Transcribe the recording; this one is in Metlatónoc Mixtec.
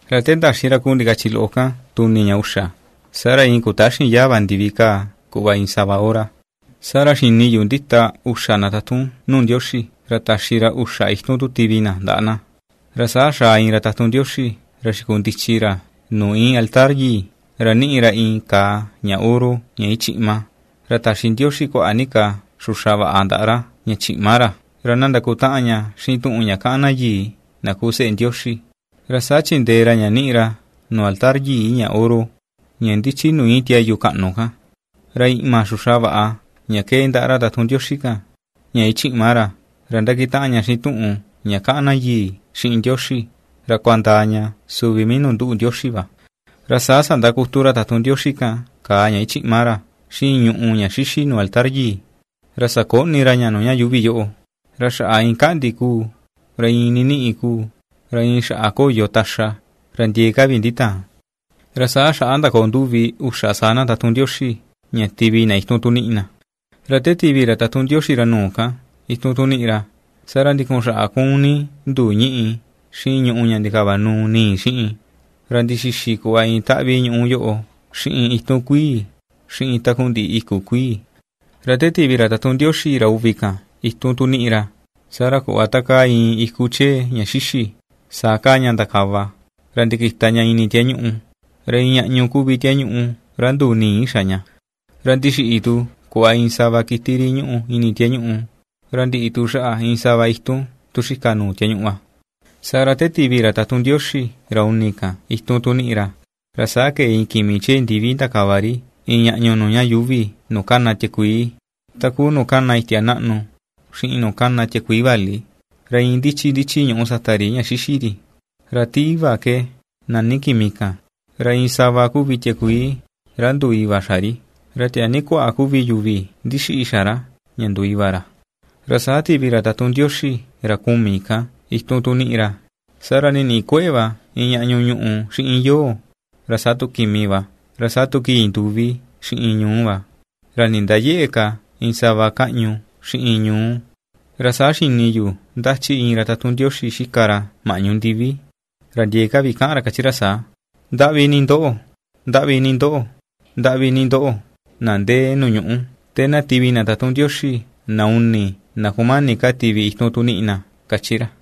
Ra te ndaxi ra kuu ndikachi loꞌo kan tuni ña uxa, saa ra iin kutaxin yaa va ndivi kaa kuꞌva iin sava hora. Saa ra xini yu ndita uxa na tatun nuu Ndioxi, ra taxi ra uxa itun tu tivi na ndaꞌa na. Ra saa xaa iin ra tatun Ndioxi, ra xikundichi ra nuu íin altar yii, ra ^niꞌi ra iin kaa ña oro ña ^ichiꞌma, ra taxi Ndioxi kuaꞌa ni ka xuxa vaꞌa ndaꞌa ra, ña chiꞌma ra, ra na ndakutaꞌan ña xiꞌin tuꞌun ña kaꞌan na yii, na ku seꞌe Ndioxi. Ra saa chindee ra ña ^niꞌi ra nuu altar yii, ña oro, ña ^ndichi nuu íin tiayu kaꞌnu kan. Ra iꞌma xuxa vaꞌa, ña ^kee ndaꞌa ra tatun Ndioxi kan, ña ichiꞌma ra, ra ^ndakitaꞌan ña xiꞌin tuꞌun ña kaꞌan na yii xiꞌin Ndioxi, ra ^kuandaa ña suvi mii nuu nduꞌu Ndioxi va. Ra saa sandakutu ra tatun Ndioxi kan kaa ña ichiꞌma ra xiꞌin ñùꞌù ña xixi nuu altar yii, ra sakoꞌni ra ña nuu ña yuuvi yoꞌo, ra xaꞌa iin kaꞌndi kuu ra iin niniꞌi kuu, ra iin xaꞌa koyo taxa, ra ndiee ka vi nditaan. Ra saa xaꞌa ndakoo nduvi uxa saa na tatun Ndioxi, ña tivi na itun tu niꞌi na. Ra te tivi ra tatun Ndioxi ra nuu kan itun tu niꞌi ra, saa ra ndikun xaꞌa ^kuun ni nduu ñíꞌi xiꞌin ñùꞌù ña ndikavanuu ni̱i̱ xiꞌin, ra ndixixi kuꞌva iin taꞌvi ñuꞌu yoꞌo xiꞌin itun kuii, xiꞌin takundiꞌi iku kuii. Ra te tivi tu ra tatun Ndioxi ra uvi kan itun tu niꞌi ra, saa ra kuꞌva takaa iin iku chee ña xixi, saa kaa ña ndakava, ra ndikita ña ini tiañuꞌu, ra iin ñaꞌñu kuvi tiañuꞌu ra nduu ni̱i̱ xa ña. Ra ndixiꞌi tu kuꞌva iin sava kiti ri ñúꞌu ini tiañuꞌu, ra ndiꞌi tu xaꞌa iin sava itun tu xika nuu tiañuꞌu va. Saa ra te tivi ra tatun Ndioxi ra uni kan itun tu niꞌi ra, ra saa kee iin kimi chee ndivi ndakava ri iin ñaꞌñu nuu ña yuuvi nuu kana tiakuii, ta kuu nuu kana itia naꞌnu xiꞌin nuu kana tiakuii vali; ra iin ndichi ndichi ñùꞌù sata ri ña ^xixi ri. Ra ti Iva ke nani kimi kan, ra iin sava kuvi tiakuii ra nduu iva xa ri, ra tiaa ni kuaꞌa kuvi yuvi ndixiꞌi xa ra, ña nduu iva ra. Ra saa tivi ra tatun Ndioxi ra kumi kan itun tu niꞌi ra, saa ra niniꞌi kueꞌe va iin ñaꞌñu ñuꞌù xiꞌin yoo, ra saa tu kimi va; ra saa tu kii nduvi xiꞌin ñuú va, ra nindayëꞌe ka iin sava káꞌñu xiꞌin ñuú. Ra saa xini yu ^ndachi iin ra tatun Ndioxi ^xika ra maꞌñu ndivi, ra ndiee ka vi kaꞌan ra ^kachi ra saa: ―Ndaꞌvi ni ndoꞌo, ndaꞌvi ni ndoꞌo, ndaꞌvi ni ndoꞌo, na ndee nuu ñuꞌú, te na tivi na tatun Ndioxi, na uni, na kumani ka tivi itun tu niꞌi na ―^kachi ra.